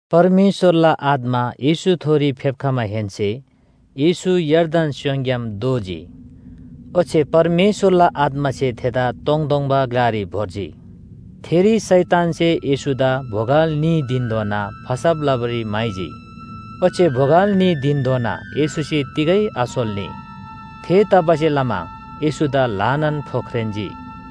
परमेश्‍वरला आत्‍मा येशूथोरी फेप्‍खमाहेन्‍से येशू यर्दन स्‍योङग्‍याम दोःजी। ओच्‍छे परमेश्‍वरला आत्‍मासे थेदा तोङतोङबा ग्‍लारी भोर्जी। थेरी शैतानसे येशूदा बोगल न्‍ही धिनधोना फसब लबारी म्‍हाइजी। ओच्‍छे बोगल न्‍ही धिनधोना येशूसे तिगै आसोल्‍नी। थेतबासेलमा येशूदा ल्‍हानान फोख्रेन्‍जी।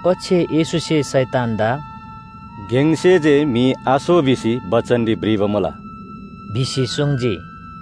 ओच्‍छे येशूसे शैतानदा “गेङसे जे म्‍हि आसो भिसी बचनरी भ्रिबा मुला” भिसी सुङ्जी।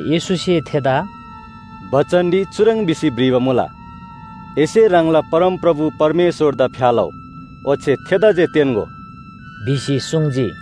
येशूसे थेदा “बचनरी चुह्रङ् भिसी भ्रिबा मुला, ‘एसे ह्राङला परमप्रभु परमेश्‍वरदा फ्‍या लउ, ओच्‍छे थेदा जे तेन्‍गो’” भिसी सुङ्जी।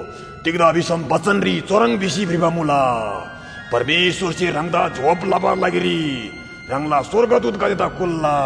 तिग्‍दा भिसम बचनरी चुह्रङ् भिसी भ्रिबा मुला, ‘परमेश्‍वरसे ह्राङदा जोगब लबाला लागिरी ह्राङला स्‍वर्गदूतगदेदा कुल्‍ला।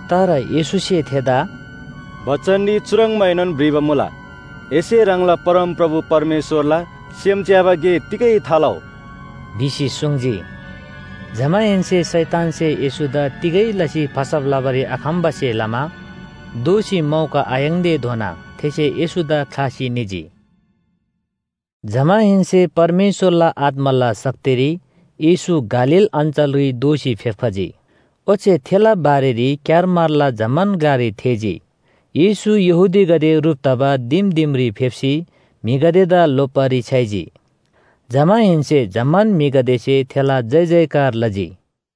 तर येशूसे थेदा “बचनरी चुह्रङ्बाएनोन भ्रिबा मुला, ‘एसे ह्राङला परमप्रभु परमेश्‍वरला सेम च्‍याबा गे तिगै थालउ’” भिसी सुङ्जी। जमाहेन्‍से शैतानसे येशूदा तिगै लसी फसब लबारी आखम्‍बासे लमा दोःसी मौका आयाङ्‌तेधोना थेसे येशूदा ख्‍लासी निजी। जमाहेन्‍से परमेश्‍वरला आत्‍माला शक्तिरी येशू गालील अञ्‍चलरी दोःसी फेप्‍खजी। ओच्‍छे थेला बारेरी क्‍यारमारला जम्‍मान ग्‍लारी थेःजी। येशू यहूदीगदे ह्रुप तबा दिम दिमरी फेप्‍सी म्‍हिगदेदा लोप्‍बारी छ्‌याइजी। जमाहेन्‍से जम्‍मान म्‍हिगदेसे थेला जयजयकार लजी।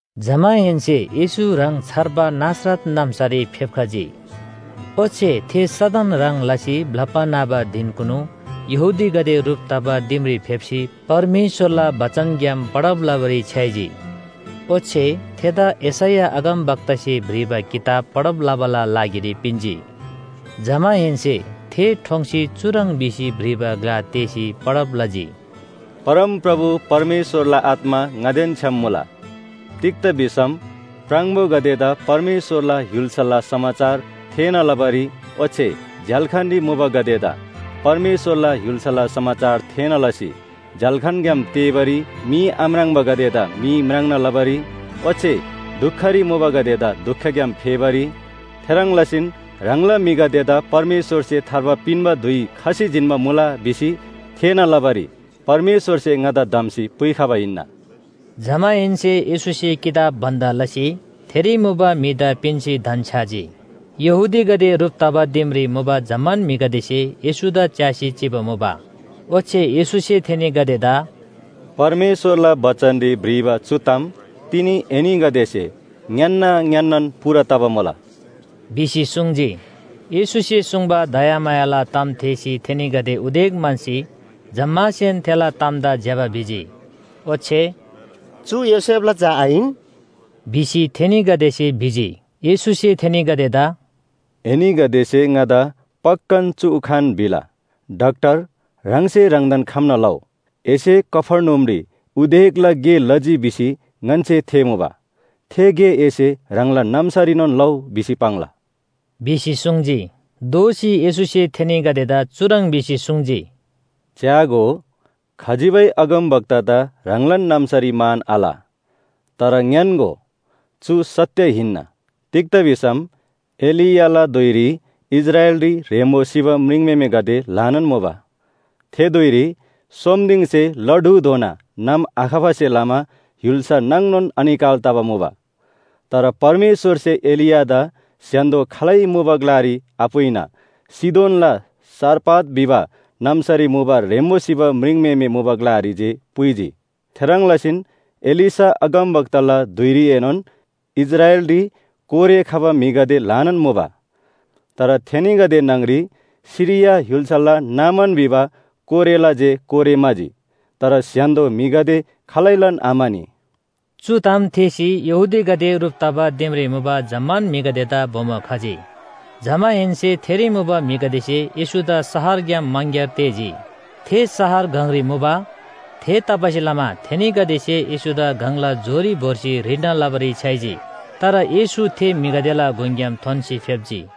जमाहेन्‍से येशू ह्राङ छर्बा नासरत नाम्‍सारी फेप्‍खजी। ओच्‍छे थे सदन ह्रङ् लसी ब्‍लप्‍बा न्‍हबा धिनकुनु यहूदीगदे ह्रुप तबा दिमरी फेप्‍सी परमेश्‍वरला बचनग्‍याम पढब लबारी छ्‌याइजी। ओच्‍छे थेदा यशैया अगमवक्तासे भ्रिबा किताब पढब लबाला लागिरी पिन्‍जी। जमाहेन्‍से थे ठोङ्सी चुह्रङ् भिसी भ्रिबा ग्‍ला तेःसी पढब लजी। “परमप्रभु परमेश्‍वरला आत्‍मा ङादेन छ्‌याम मुला। तिग्‍दा भिसम प्राङबोगदेदा परमेश्‍वरला य्‍हुल्‍साला समाचार थेःना लबारी ओच्‍छे झ्‍याल्‍खानरी मुबागदेदा परमेश्‍वरला य्‍हुल्‍साला समाचार थेःना लसी झ्‍याल्‍खानग्‍याम तेःबारी, मी आम्राङ्बागदेदा मी म्राङ्ना लबारी ओच्‍छे दुखरी मुबागदेदा दुखग्‍याम फेबारी, थेह्रङ् लसीन ह्राङला म्‍हिगदेदा परमेश्‍वरसे थार्बा पिन्‍बा धुइ खसी जिन्‍बा मुला भिसी थेःना लबारी परमेश्‍वरसे ङादा धम्‍सी पुइखबा हिन्‍ना।” जमाहेन्‍से येशूसे किताब बन्‍द लसी थेरी मुबा म्‍हिदा पिन्‍सी धन्‍छ्‌याजी। यहूदीगदे ह्रुप तबा दिमरी मुबा जम्‍मान म्‍हिगदेसे येशूदा च्‍यासी चिबा मुबा। ओच्‍छे येशूसे थेनीगदेदा “परमेश्‍वरला बचनरी भ्रिबा चु ताम तिनी एनीगदेसे ङ्‌यान्‍ना ङ्‌यान्‍नान पूरा तबा मुला” भिसी सुङ्जी। येशूसे सुङ्बा दयामायाला ताम थेःसी थेनीगदे उदेक म्‍हन्‍सी जम्‍मासेन थेला तामदा ज्‍यबा भिजी। ओच्‍छे “चु योसेफला झा आहिन?” भिसी थेनीगदेसे भिजी। येशूसे थेनीगदेदा “एनीगदेसे ङादा पक्‍कान चु उखान भिला ‘डाक्‍टर, ह्राङसे ह्राङदान खम्‍ना लउ। एसे कफर्नहुमरी उदेकला गे लजी भिसी ङन्‍से थेःमुबा थे गे एसे ह्राङला नाम्‍सारीनोन लउ’ भिसी पाङ्ला” भिसी सुङ्जी। दोःसी येशूसे थेनीगदेदा चुह्रङ् भिसी सुङ्जी, “च्‍यागो, खजिबै अगमवक्तादा ह्राङलान नाम्‍सारी मान आल। तर ङ्‌यान्‍गो, चु सत्‍य हिन्‍ना। तिग्‍दा भिसम एलियाला धुइरी इस्राएलरी ह्रेम्‍बो सिबा म्रिङम्‍हेमेगदे ल्‍हानान मुबा। थे धुइरी सोम दिङसे ला ढुधोना नाम आखबासे लमा य्‍हुल्‍सा नाङनोन अनिकाल तबा मुबा। तर परमेश्‍वरसे एलियादा स्‍य्‍हान्‍दो खालै मुबा ग्‍लारी आपुइना सीदोनला सारपत भिबा नाम्‍सारी मुबा ह्रेम्‍बो सिबा म्रिङम्‍हेमे मुबा ग्‍लारी जे पुइजी। थेह्रङ् लसीन एलीशा अगमवक्ताला धुइरीएनोन इस्राएलरी कोरे खबा म्‍हिगदे ल्‍हानान मुबा। तर थेनीगदे न्‍हङरी सिरिया य्‍हुल्‍साला नामान भिबा कोरेला जे कोरे म्‍हाजी। तर स्‍य्‍हान्‍दो म्‍हिगदे खालैलान आम्‍हानी।” चु ताम थेःसी यहूदीगदे ह्रुप तबा दिमरी मुबा जम्‍मान म्‍हिगदेदा बोमो खजी। जमाहेन्‍से थेरी मुबा म्‍हिगदेसे येशूदा शहरग्‍याम मङग्‍यार तेःजी। थे शहर गङरी मुबा, थेतबासेलमा थेनीगदेसे येशूदा गङला जोरी भोर्सी ह्रिल्‍ना लबारी छ्‌याइजी। तर येशू थे म्‍हिगदेला गुङग्‍याम थोन्‍सी फेप्‍जी।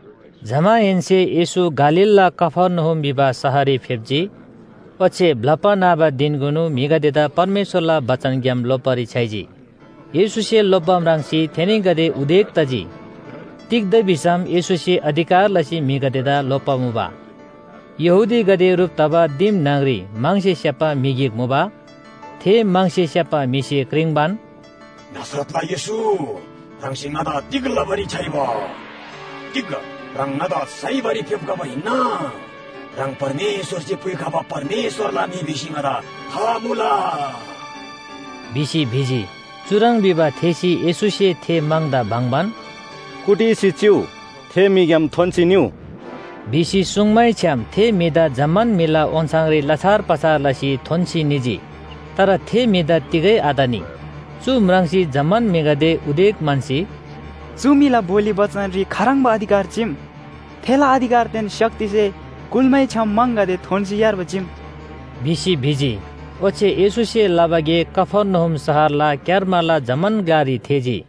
जमाहेन्‍से येशू गालीलला कफर्नहुम भिबा शहररी फेप्‍जी। ओच्‍छे ब्‍लप्‍बा न्‍हबा धिनकुनु म्‍हिगदेदा परमेश्‍वरला बचनग्‍याम लोप्‍बारी छ्‌याइजी। येशूसे लोप्‍बा म्राङ्सी थेनीगदे उदेक तजी। तिग्‍दा भिसम येशूसे अधिकार लसी म्‍हिगदेदा लोप्‍बा मुबा। यहूदीगदे ह्रुप तबा दिम न्‍हङरी म्‍हङसे स्‍याप्‍बा म्‍हि गिक मुबा। थे म्‍हङसे स्‍याप्‍बा म्‍हिसे क्रिङ्बान, “नासरतला येशू, ह्राङसे ङन्‍दा तिग लबारी छ्‌याइबा? तिग ह्राङ ङन्‍दा साइबारी फेप्‍खबा हिन्‍ना? ह्राङ परमेश्‍वरसे पुइखबा परमेश्‍वरला म्‍हि भिसी ङादा था मुला” भिसी भिजी। चुह्रङ् भिबा थेःसी येशूसे थे म्‍हङदा बङ्‍बान, “कुटिसी चिउ! थे म्‍हिग्‍याम थोन्‍सी निउ!” सुङ्मैछ्‌याम थे म्‍हिदा जम्‍मान म्‍हिला ओन्‍छाङरी लछार पछार लसी थोन्‍सी निजी, तर थे म्‍हिदा तिगै आतनी। चु म्राङ्सी जम्‍मान म्‍हिगदे उदेक म्‍हन्‍सी, “चु म्‍हिला बोली बचनरी खाह्रङ्बा अधिकार चीम, थेला अधिकारदेन शक्तिसे कुल्‍मैछ्‌याम म्‍हङगदे थोन्‍सी यार्बा चीम!” भिसी भिजी। ओच्‍छे येशूसे लबा गे कफर्नहुम शहरला क्‍यारमारला जम्‍मान ग्‍लारी थेःजी।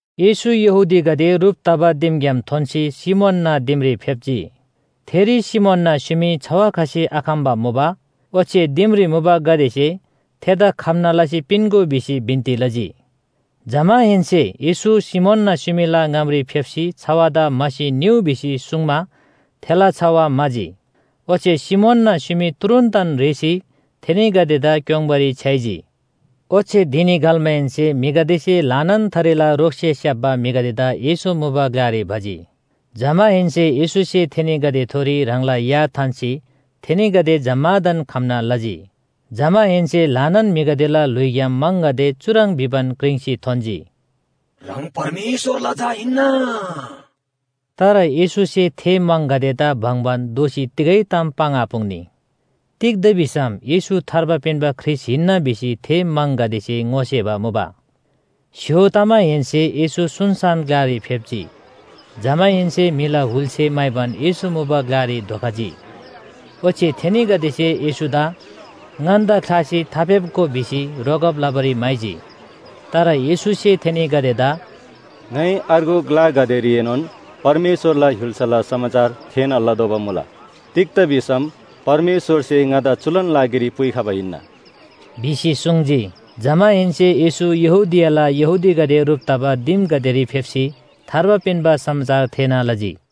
येशू यहूदीगदे ह्रुप तबा दिमग्‍याम थोन्‍सी सिमोनना दिमरी फेप्‍जी। थेरी सिमोनना स्‍युमी छवा खसी आखम्‍बा मुबा। ओच्‍छे दिमरी मुबागदेसे “थेदा खम्‍ना लसी पिन्‍गो” भिसी बिन्‍ती लजी। जमाहेन्‍से येशू सिमोनना स्‍युमीला ङामरी फेप्‍सी छवादा म्‍हासी निउ भिसी सुङ्मा थेला छवा म्‍हाजी। ओच्‍छे सिमोनना स्‍युमी तुरुन्‍तन रेःसी थेनीगदेदा क्‍योङ्बारी छ्‌याइजी। ओच्‍छे धिनी घल्‍माहेन्‍से म्‍हिगदेसे ल्‍हानान थरीला रोगसे स्‍याप्‍बा म्‍हिगदेदा येशू मुबा ग्‍लारी भजी। जमाहेन्‍से येशूसे थेनीगदेथोरी ह्राङला या थान्‍सी थेनीगदे जम्‍मादान खम्‍ना लजी। जमाहेन्‍से ल्‍हानान म्‍हिगदेला ल्‍हुइग्‍याम म्‍हङगदे चुह्रङ् भिबान क्रिङ्सी थोन्‍जी, “ह्राङ परमेश्‍वरला झा हिन्‍ना।” तर येशूसे थे म्‍हङगदेदा बङ्‍बान दोःसी तिगै ताम पाङ्आपुङ्नी। तिग्‍दा भिसम येशू थार्बा पिन्‍बा ख्रीष्‍ट हिन्‍ना भिसी थे म्‍हङगदेसे ङोसेबा मुबा। स्‍य्‍हो तमाहेन्‍से येशू सुनसान ग्‍लारी फेप्‍जी। जमाहेन्‍से म्‍हिला हुलसे म्‍हाइबान येशू मुबा ग्‍लारी धोखजी। ओच्‍छे थेनीगदेसे येशूदा “ङन्‍दा ख्‍लासी थाफेप्‍गो” भिसी रोकब लबारी म्‍हाइजी। तर येशूसे थेनीगदेदा “ङाइ अर्गु ग्‍लागदेरीएनोन परमेश्‍वरला य्‍हुल्‍साला समाचार थेःना लतोःबा मुला। तिग्‍दा भिसम परमेश्‍वरसे ङादा चुलान लागिरी पुइखबा हिन्‍ना” भिसी सुङ्जी। जमाहेन्‍से येशू यहूदियाला यहूदीगदे ह्रुप तबा दिमगदेरी फेप्‍सी थार्बा पिन्‍बा समाचार थेःना लजी।